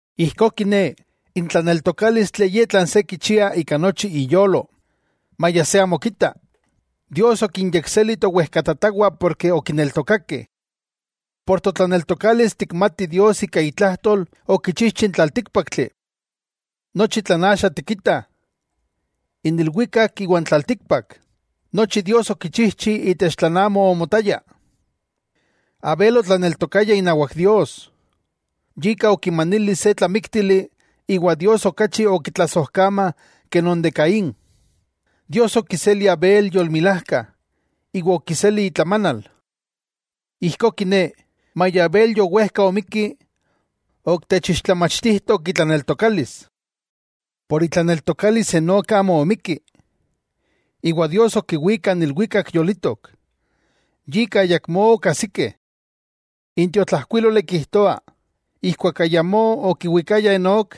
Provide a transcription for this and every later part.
Ijkó kiné, n tlaneltokálistli ye tlan se kichia ika nochi iyolo, maya se amo kita. Dios okinyekseli towejkatatawah ken okineltokakeh. Ika totlaneltokalis tikmatih Dios ika itlajtol okichijchi n tlaltíkpaktli. Nochi tlan axa tikitah, n ilwikak iwa n tlaltikpak, nochi Dios okichijchi itech tlan amo omotaya. Abel otlaneltokaya inawak Dios, yika okimanili se tlamíktili iwa Dios okachi okitlasojkamah ke non de Caín. Dios okiseli Abel yolmilajka iwa okiseli itlamanal. Ijkó kiné, maya Abel yowejka omikki, ok techixtlamachtijtok itlaneltokalis. Por itlaneltokalis Enok amo omikki, iwa Dios okiwík kan ilwikak yolitok, yika ayakmó okajsikeh. N tiotlajkuíloli kijtoa, ijkuak ayamó okiwikaya Enok,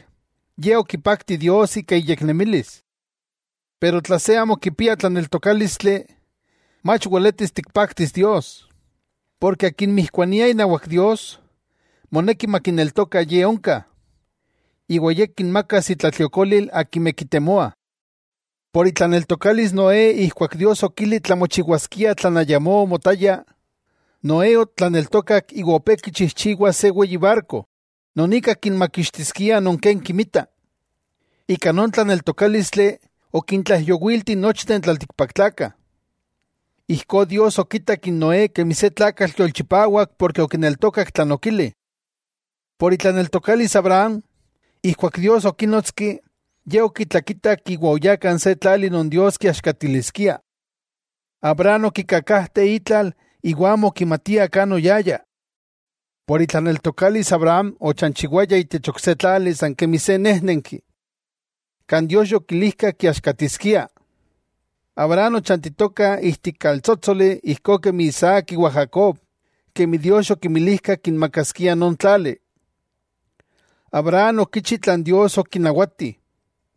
ye okipakti Dios ika iyeknemilis. Pero tla se amo kipia tlaneltokálistli, mach weletis tikpaktis Dios, porke akin mijkuania inawak Dios, moneki makineltoka Ye onka, iwa Ye kinmakas intlatliokolil akimeh kitemoah. Por itlaneltokalis Noé ijkuak Dios okili tlamochiwaskia, tlan ayamó omotaya, Noé otlaneltokak iwa opé kichijchiwa se weyi barko, non ika kinmakixtiskia non ken kimita. Ika non tlaneltokálistli okintlaijyowiltih nochteh n tlaltikpaktlakah. Ijkó Dios okitak n Noé kemi se tlakatl yolchipawak por okineltokak tlan okili. Por itlaneltokalis Abraham, ijkuak Dios okínotski, ye okitlakitak iwa oyá kan se tlali non Dios kiaxkatiliskia. Abraham okikakajte itlal iwa amo okimatia kan oyaya. Por itlaneltokalis Abraham ochanchiwaya itech ok se tlali san kemi se néjnenki, kan Dios yokilijka kiaxkatiskia. Abraham ochantitoka ijtik kaltsótsoli ijkó kemi Isaac iwa Jacob, kemi Dios yokinmilijka kinmakaskia non tlali. Abraham okichi tlan Dios okinawati,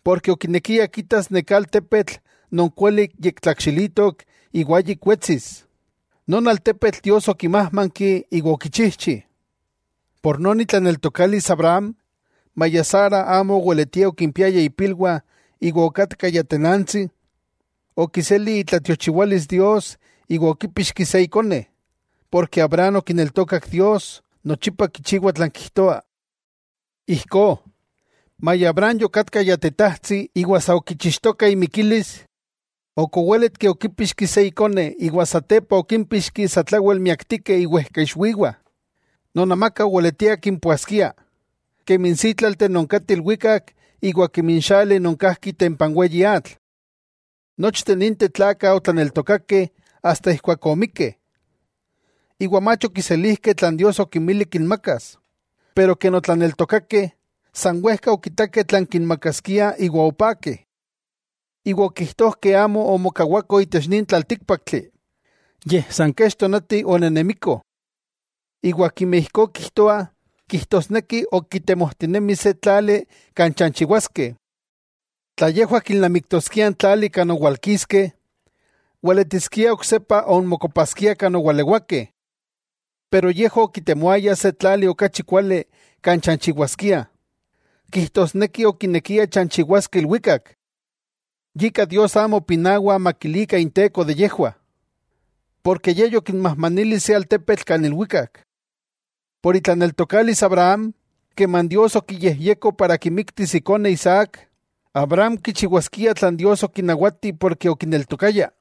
porke okinekia kitas neká altepetl non kuali yektlakxilitok iwa ayik wetsis, non altepetl Dios okimájmanki iwa okichijchi. Ika non itlaneltokalis Abraham, maya Sara amo oweletia okimpiaya ipilwah iwa okatka ya tenantsi, okiseli itlatiochiwalis Dios iwa okípixki se ikone, porke Abraham okineltokak Dios nochipa kichiwa tlan kijtoa. Ijkó, maya Abraham yokatka ya tetajtsi iwa sa okichixtoka imikilis, ok oweletki okipixki se ikone iwa satepa okimpíxki satlawel miaktikeh iwejkaixwiwah, non amaka oweletia kimpoaskia, kemi n sítlalteh non kateh ilwikak iwa kemi n xali non kajki itempa n weyi atl. Nochteh ninteh tlakah otlaneltokakeh asta omikkeh. Iwa mach okiselijkeh tlan Dios okinmili kinmakas, pero ken otlaneltokakeh, san wejka okitakeh tlan kinmakaskiah iwa opakeh. Iwa okijtojkeh amo omokawakoh itech nin tlaltíkpaktli, yej san kech tonati onenemikoh. Iwa akimeh ijkó kijtoah, kijtosneki ok kitemojtinemih se tlali kan chanchiwaskeh. Tla yejwah kilnamiktoskiah n tlali kan owalkiskeh, weletiskia oksepa onmokopaskiah kan owalewakeh. Pero yejwah okitemoayah se tlali okachi kuali kan chanchiwaskiah, kijtosneki okinekiah chanchiwaskeh ilwikak. Yika Dios amo pinawa makilikah Inteko de yejwah, porke Ye yokinmajmanili se altepetl kan ilwikak. Por itlaneltokalis Abraham, keman Dios okiyejyeko, para kimiktis ikone Isaac, Abraham kichiwaskia tlan Dios okinawati porke okineltokaya.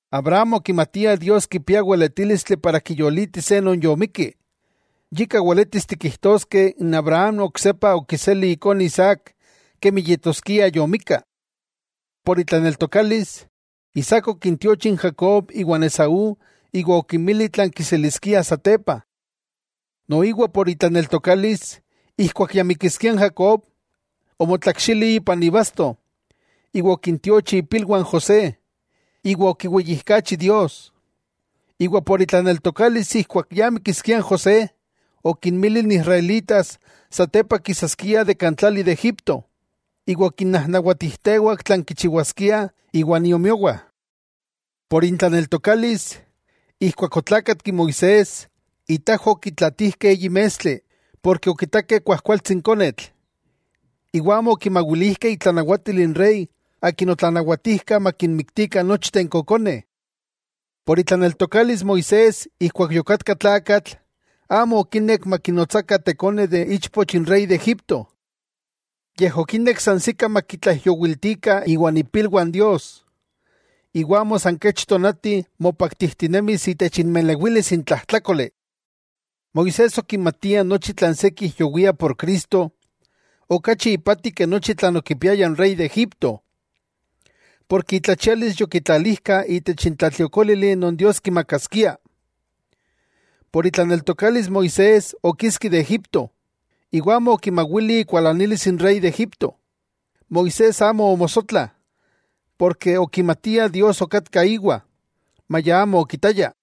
Abraham okimatia Dios kipia weletílistli para kiyolitis se non yomikki, yika weletis tikijtoskeh Abraham oksepa okiseli ikone Isaac kemi yetoskia yomikka. Ika itlaneltokalis, Isaac okintiochi n Jacob iwa n Esaú iwa okinmili tlan kiseliskia satepa. Noiwa ika itlaneltokalis, ijkuak ya mikiskia n Jacob, omotlakxili ipan ibasto iwa okintiochi ipilwah n José, iwa okiweyijkachi Dios. Iwa ika itlaneltokalis ijkuak ya mikiskia n José, okinmili n israelitas satepa kisaskiah itech tlali de Egipto, iwa okinnajnawatijtewak tlan kichiwaskiah iwan iomiowah. Ika intlaneltokalis, ijkuak otlákatki Moisés, itajwah okitlatijkeh eyi mestli, porke okitakeh kuajkualtsi n konetl, iwa amo okimawilijkeh itlanawatil n rey akin otlanawatijka makinmiktikah nochteh n kokoneh. Ika itlaneltokalis Moisés ijkuak yokatka tlakatl, amo okinek makinotsakah ikone ichpoch n rey de Egipto. Yej okinek sansikah makitlaijyowiltikah iwan ipilwah n Dios, iwa amo san kech tonati mopaktijtinemis itech inmelewilis n tlajtlákoli. Moisés okimatia nochi tlan se kijyowia por Cristo, okachi ipati ke nochi tlan okipiaya n rey de Egipto, ken itlachialis yokitlalijka itech n tlatliokólili non Dios kimakaskia. Ika itlaneltokalis Moisés okiski de Egípto, iwa amo okimawili ikualanilis n Rey de Egipto, Moisés amo omosotla, ken okimatia Dios okatka íwa, maya amo okitaya.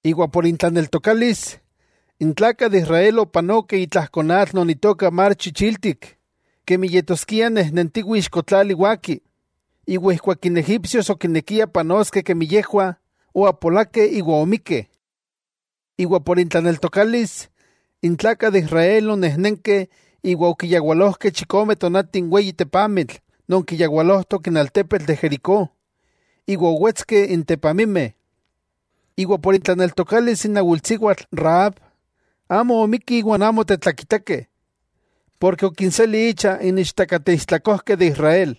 Iwa ika intlaneltokalis, n tlakah de Israel opanokeh itlajko atl non itoka mar chichiltik kemi yetoskia nejnentiwih ixko tlali waki, iwa ijkuak n egipsios okinekiah panoskeh kemi yejwah, oapolakeh iwa omikkeh. Iwa ika intlaneltokalis, n tlakah de Israel onenenkeh iwa okiyawalojkeh chikomeh tonati n weyi tepamitl non kiyawalojtok n altepetl de Jericó iwa owetskeh n tepamimeh. Iwa ika itlaneltokalis n awilsiwatl Rahab, amo omikki iwan amo tetlakitakeh, porke okinseli icha n ichtakateistlakojkeh de Israel.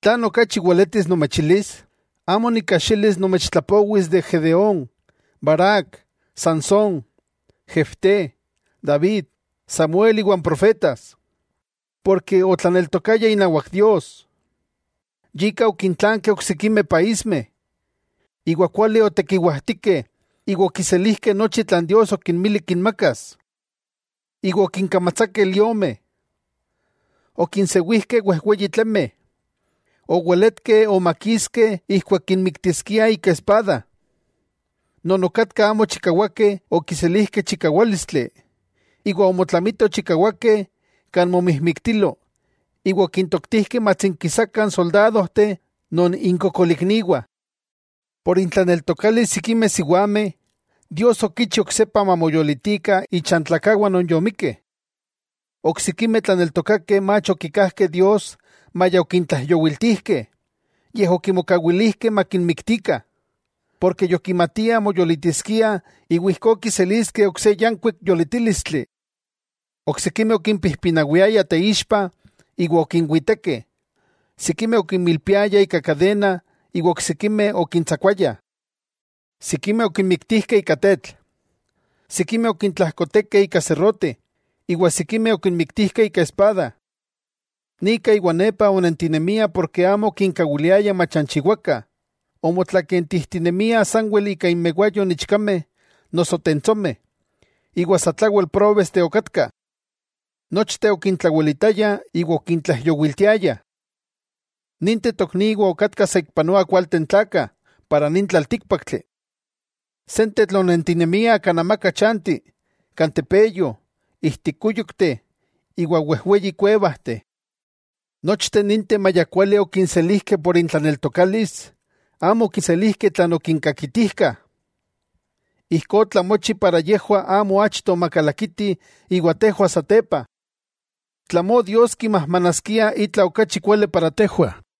¿Tlan okachi weletis nomechilis? Amo nikajxilis nomechtlapowis de Gedeón, Barac, Sansón, Jefté, David, Samuel iwa n profetas. Porke otlaneltokayah inawak Dios, yika okintlankeh oksikimeh paísmeh, iwa kuali otekiwajtikeh iwa okiselijkeh nochi tlan Dios okinmili kinmakas. Iwa okinkamatsakeh liomeh, okinsewijkeh wejweyi tlemeh, oweletkeh omakiskeh ijkuak kinmiktiskia ika espada. Non okatka amo chikawakeh okiselijkeh chikawálistli iwa omotlamitoh chikawakeh kan momijmiktilo, iwa okintoktijkeh matsinkisakah n soldadojteh non inkokolikniwah. Ika intlaneltokalis sikimeh siwameh, Dios okichi oksepa mamoyolitikah ichantlakawah non yomikkeh. Oksikimeh tlaneltokakeh mach okikajkeh Dios maya okintlaijyowiltijkeh, yej okimokawilijkeh makinmiktikah, ken yokimatiah moyolitiskiah iwa ijkó kiseliskeh ok se yankuik yolitílistli. Oksikimeh okimpijpinawiayah teixpa iwa okinwitekeh, sikimeh okinmilpiayah ika kadena iwa oksikimeh okintsakuayah. Sikimeh okinmiktijkeh ika tetl, sikimeh okintlajkotekeh ika serrote, iwa sikimeh okinmiktijkeh ika espada. Nika iwa nepa onentinemiah ken amo okinkawiliayah machanchiwakah, omotlakentijtinemiah sanwel ika inmewayo n ichkameh noso tentsomeh iwa satlawel próbesteh okatkah. Nochteh okintlawelitayah iwa okintlaijyowiltiayah. Ninteh tokniwah okatkah saikpanoa kualteh n tlakah itech nin tlaltíkpaktli. Sentetl onentinemiah kan amaka chanti, kan tepeyo, ijtik kúyokteh iwa wejweyi kuevajteh. Nochteh ninteh maya kuali okinselijkeh por intlaneltokalis, amo okiselijkeh tlan okinkakitijkah. Ijkó otlamochi, para yejwah amo achto makalakiti iwa tejwah satepa. Tlamó Dios kimajmanaskia itla okachi kuali para tejwah.